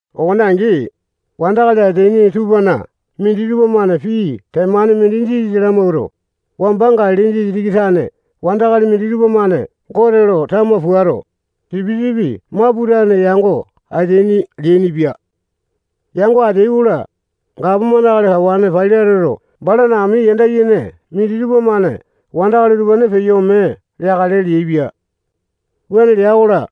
Okone angi, wandakali ateaini tupana minditupa-mane pii temane mindi Jisasa lamawuato, wamba Galili disitiki tane wandakali minditupa-mane Gote lo tama puato, sipisipi maputane yango ateaini leainipia. Yango ateai-kola, gapomane akali kawane Pailateto balana ami yanda yene minditupa-mane wandakali utupane peyo ome leakale leaipia. Wuane lea-kola,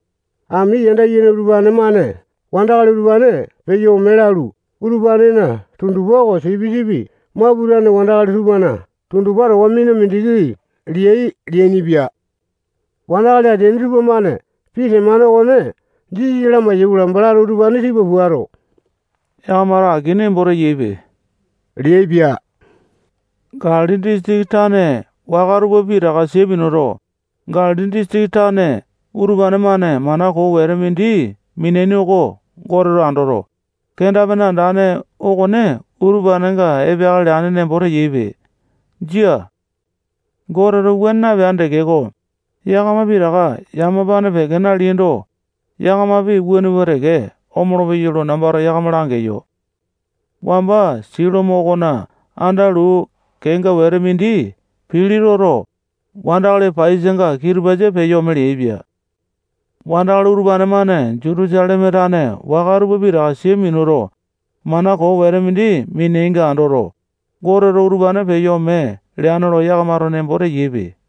ami yanda yene utupane-mane wandakali utupane peyo ome lalu, utupanena tundupa oko sipisipi maputane wandakali tupana tundupa towa mina mindiki leai leainipia. Wandakali ateaini tupamane pii temane okone Jisasa lamai-yaikola, balato utupane tipa puato, yakamato aki nembo teyaipe leaipia. Galili disitiki tane waka tupa pitaka sia minuto, Galili disitiki tane utupane-mane mana koo wete mindi mineaini oko Goteto andoto, kenda-pene andane okone utupanenga epeakale leane nembo teyaipe. Jia. Goteto wuane napeane tekeko, yakama pitaka yamapane peke naleaindo, yakamapi wuane pua teke omolo-peyai lo nambato yakama langeyo. Wamba Silomo okona anda luu kenga wete mindi pili toto, wandakali paiyasanga kitupasa peyo ome leaipia. Wandakali utupane-mane Jutusaleme tane waka tupa pitaka sia minuto, mana koo wete mindi mineaininga andoto, Goteto utupane peyo ome leane lo yakamato nembo teyaipe.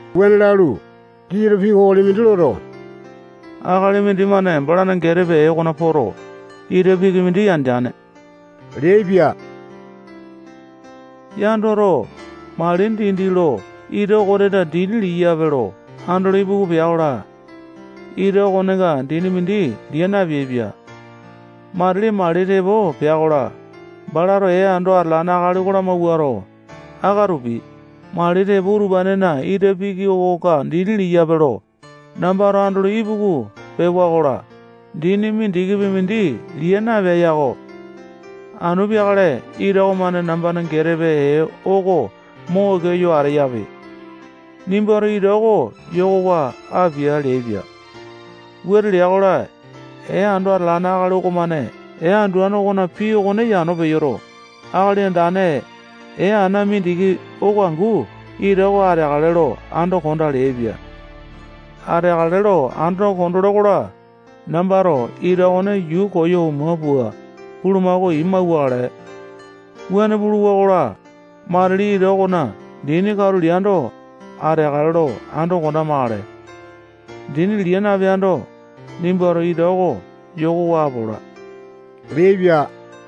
Wuane lalu, Jisasato pii kokoli mindi loto, akali mindimane balana getepe ee okona poto, ita piki mindi yandeane leaipia. Yandoto, mali dindi lo ita okonena dini liyape lo andolo ipuku pea-kola, ita okonenga dini mindi lia napeaipia. Matili mali tepo pea-kola, balato ee ando atalane akali oko lamawuato, akatupi, mali tepo utupanena ita piki okonga dini liyape lo, nambato andolo ipuku pewa-kola, dini mindikipi mindi lia napiyae yako. Anu peakale ita okomane nambana getepe ee oko mo oke yo ateyape. Nimbato ita oko yokowa apia leaipia. Wuane lea-kola, ee ando atalane akali okomane ee anduane okona pii okone yano peyoto, akali andane, ee ana mindiki oko angu ita oko ateakale lo ando kondaa leaipia. Ateakale lo ando kondole-kola, nambato ita okone yuu koyo oma pua, bulumako ii mauwakale. Wuane puluwa-kola, matili ita okona dini katulo liyando, ateakale lo ando kondamakale. Dini lia napeando, nimbato ita oko yokowa apola leaipia.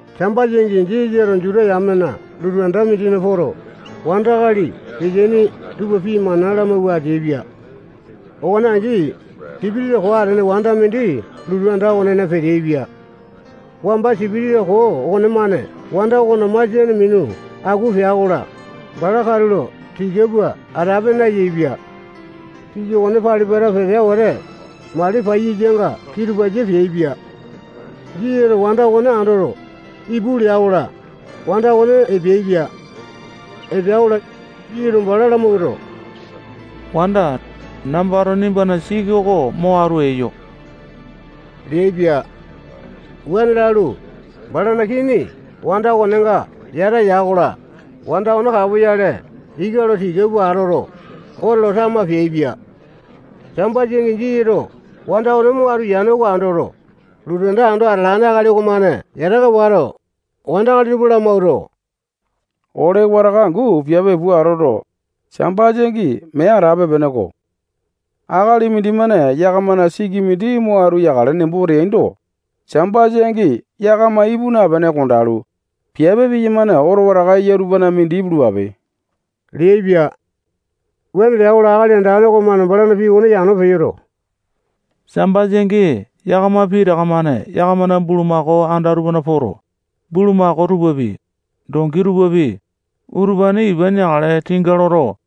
Sambasa angi Jisasato Juta yamena lotu anda mindina poto, wandakali peteaini tupa pii mana lamawua ateaipia. Okone angi, sipitisa koo atene wanda mindi lotu anda okonena peteaipia. Wamba sipitisa koo okonemane wanda okona masiane minu aku pea-kola, bala katulo tika pua atape nayaepia. Siki okone pali-pata petea wete, mali paiyasanga kitupasa peaipia. Jisasato wanda okone andoto, ipu lea-kola, wanda okone epeaipia. Epea-kola, Jisasato bala lamawuato, wanda, nambato nimbana siki oko mo atu eyo leaipia. Wuane lalu, balana kini wanda okonenga yata ya-kola, wanda okone kapoyale ika lo tika pua atoto, Gote lo tama peaipia. Sambasa angi Jisasato wanda okone mo atu yane oko andoto, lotu anda ando atalane akali okomane yataka wato, wandakali tupa lamawuato, ole wataka angu piape pua atoto, Sambasa angi mee atape-peneko. Akali mindimane yakamana siki mindi mo atu yakale nembo teaindo, Sambasa angi yakama ipu napene kondalu, piape piyamane oto wataka eya tupana mindi ipulupape leaipia. Wuane lea-kola, Akali Andane okomane balana pii okone yano peyoto, Sambasa angi yakama pitaka-mane yakamana bulumako anda tupana poto, bulumako tupapi, dongi tupapi, utupane ipa neakale tinga loto,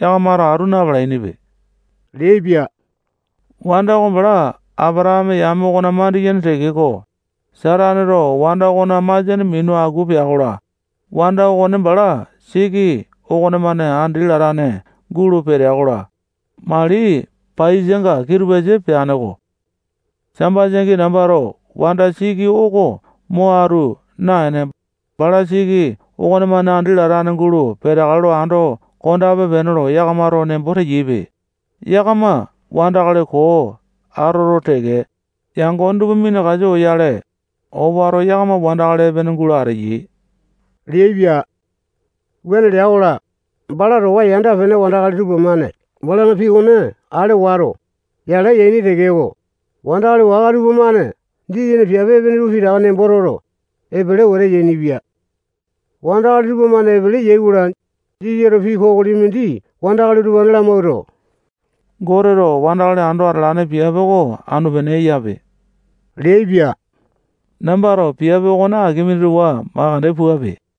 yakamato atu na-palainipe leaipia. Wanda oko bala Apatakame yame okona mandiyene tekeko, Sataneto wanda okona masiane minu aku pea-kola, wanda okone bala siki okonemane andi latane gulo petea-kola, mali paiyasanga kitupasa peane-ko. Sambasa angi nambato wanda siki oko mo atu naene, bala siki okonemane andi latane gulo peteakale lo ando kondape-pene lo yakamato nembo teyaipe. Yakama wandakali koo atoto teke, yangone tupa minakasa oyale, owato yakama wandakali epene gulo ateyai leaipia. Wuane lea-kola, bala towa yanda-pene wandakali tupamane balana pii okone ale wato, yala yaini tekeko, wandakali waka tupamane Jisasana piape epene tupa pitaka nembo toto, epele wete yainipia. Wandakali tupamane epele yai-kola, Jisasato pii kokoli mindi wandakali utupane lamawuato, Goteto wandakali ando atalane piape oko anu-pene eyape leaipia. Nambato piape okone aki mindi towa makande puape.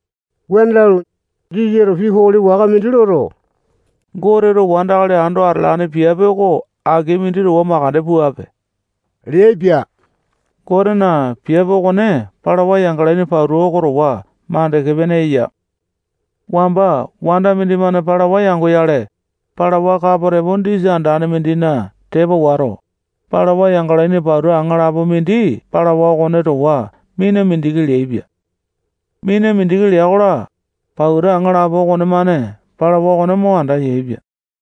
Wuane lalu, Jisasato pii kokoli waka mindi loto, Goteto wandakali ando atalane piape oko aki mindi towa mandeke puape leaipia. Gotena piape okone palawa yangalaini pauta oko towa makande pene eya. Wamba wanda mindimane palawa yangoyale, palawa kapo tepo disa andane mindina tepa wato, palawa yangalaini pauta aŋalapo mindi palawa okone towa mina mindiki leaipia. Mina mindiki lea-kola, pauta aŋalapo okonemane palawa okone mo andayaepia.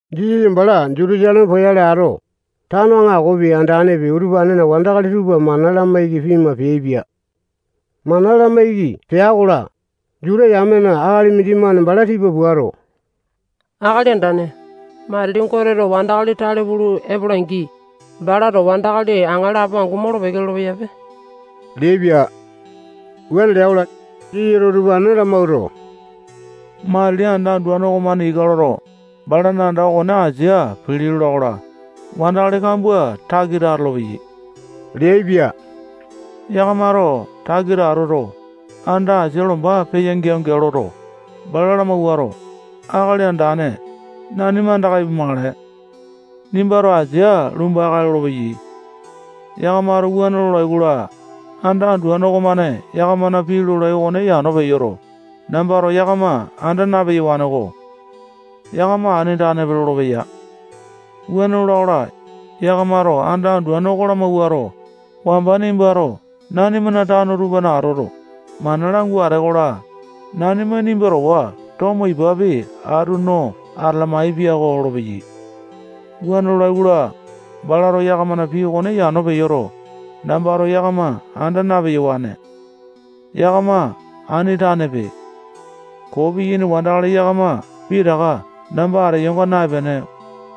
Jisasa bala Jutusaleme poyale ato, tano aŋakopi, andanepi, utupanena wandakali tupa mana lamaiki pima peaipia. Mana lamaiki pea-kola, Juta yamena akali mindimane bala tipa puato, Akali Andane, matili Goteto wandakali tale pulu epola-angi, balato wandakali aŋalapo angu molo-peke lolo-peyape leaipia. Wuane lea-kola, Jisasato utupane lamawuato, matili anda anduane okomane ika loto, balana anda okona asia pili lola-kola, wandakali kambua takita atolopeyai leaipia. Yakamato takita atoto, anda asia lomba peya geao-geao loto, bala lamawuato, Akali Andane, nanima andaka ipumakale. Nimbato asia lumba-kae lolopeyai. Yakamato wuane lolai-kola, anda anduane okomane yakamana pii lolai okone yano peyoto, nambato yakama anda na-peyawaneko. Yakama ani tanepe lolopeya. Wuane lola-kola, yakamato anda anduane oko lamawuato, wamba nimbato nanimana tano tupana atoto, mana langua atee-kola, nanima nimba towa tomo ipapi atu no atalamae piako lolopeyai. Wuane lolai-kola, balato yakamana pii okone yano peyoto, nambato yakama anda na-peyawane. Yakama ani tanepe. Koo piyaini wandakali yakama pitaka namba ateyonga naepene,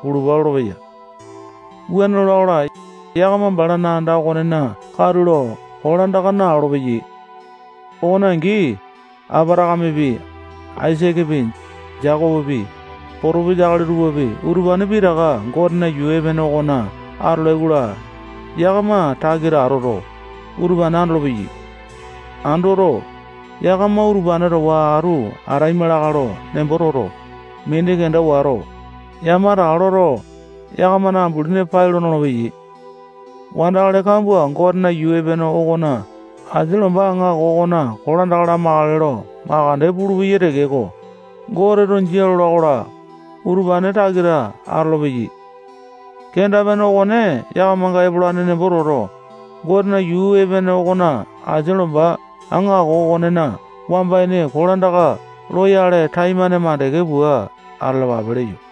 pulupa lolopeya. Wuane lola-kola, yakama balana anda okonena katulo kolandaka nalolo-peyai. Okone angi, Apatakamepi, Aisakepi, Jekopopi, potopesa akali tupapi, utupane pitaka Gotena yuu epene okona atolai-kola, yakama takita atoto, utupane andolopeyai. Andoto, yakama utupane towa atu ataima lakae lo nembo toto, mini kenda wato, yamataka loto, yakamana ambulini pai lo nolopeyai. Wandakali kambua Gotena yuu epene okona asia lomba aŋako okona kolandaka lamakale lo mandeke pulupeyai tekeko, Goteto jia lola-kola, utupane takita atolopeyai. Kenda-pene okone yakamanga epolane nemboto, Gotena yuu epene okona asia lomba aŋako okonena wamba ini kolandaka loyale taimane mandeke pua atalapape leyo.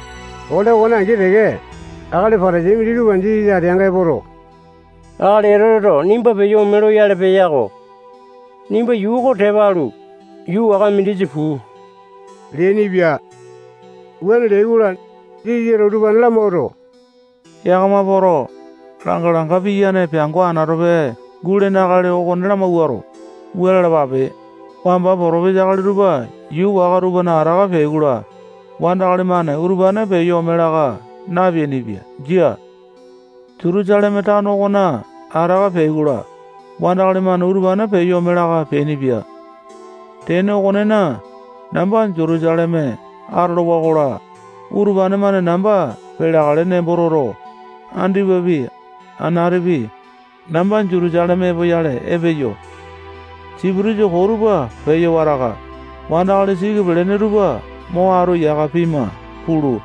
Ole okone angi teke, akali Patasai minditupa Jisasa ateanga epoto, akali Etoteto nimba peyo ome loyale peya-ko. Nimba yuu oko tepa alu, yuu waka mindisa puu leainipia. Wuane leai-kola, Jisasato utupane lamawuato, yakama poto, langa-langa piyane peango anatope gulene akali okone lamawuato, wua lalapape: Wamba potopisa akali tupa yuu waka tupana ataka peai-kola, wandakali-mane utupane peyo ome laka napeainipia. Jia. Jutusaleme tano okona ataka peai-kola, wandakali-mane utupane peyo ome laka peainipia. Tene okonena, namba Jutusaleme atolowa-kola, utupane-mane namba peleakale nembo toto, andipapi, anatipi, namba Jutusaleme epoyale epeyo. Sipitisa koo tupa peyo wataka, wandakali siki pelene tupa mo atu yaka pima pulu,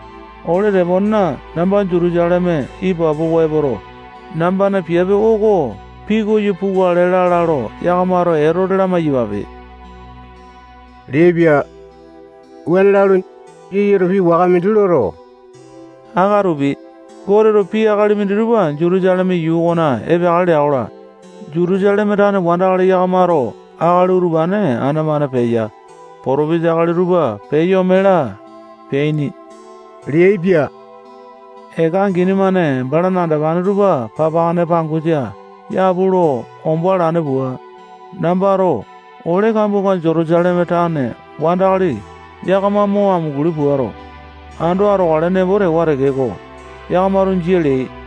ole teponena namba Jutusaleme ipapowa epoto, nambana piape oko pikoyo pukale lala lo yakamato Etote lamai-yapape leaipia. Wuane lalu, Jisasato pii waka mindi loto, akatupi, Goteto pii akali minditupa Jutusaleme yuu okona epeakale lea-kola, Jutusaleme tane wandakali yakamato akali utupane ana-mane peya, potopesa akali tupa peyo ome laa, peaini leaipia. Eka angini-mane balana andopane tupa papakane pangosa yapu lo ombo alane pua, nambato ole kambuanga Jutusaleme tane wandakali yakama mo amunguli puato, ando atokale nembo tewa tekeko, yakamato jia leai.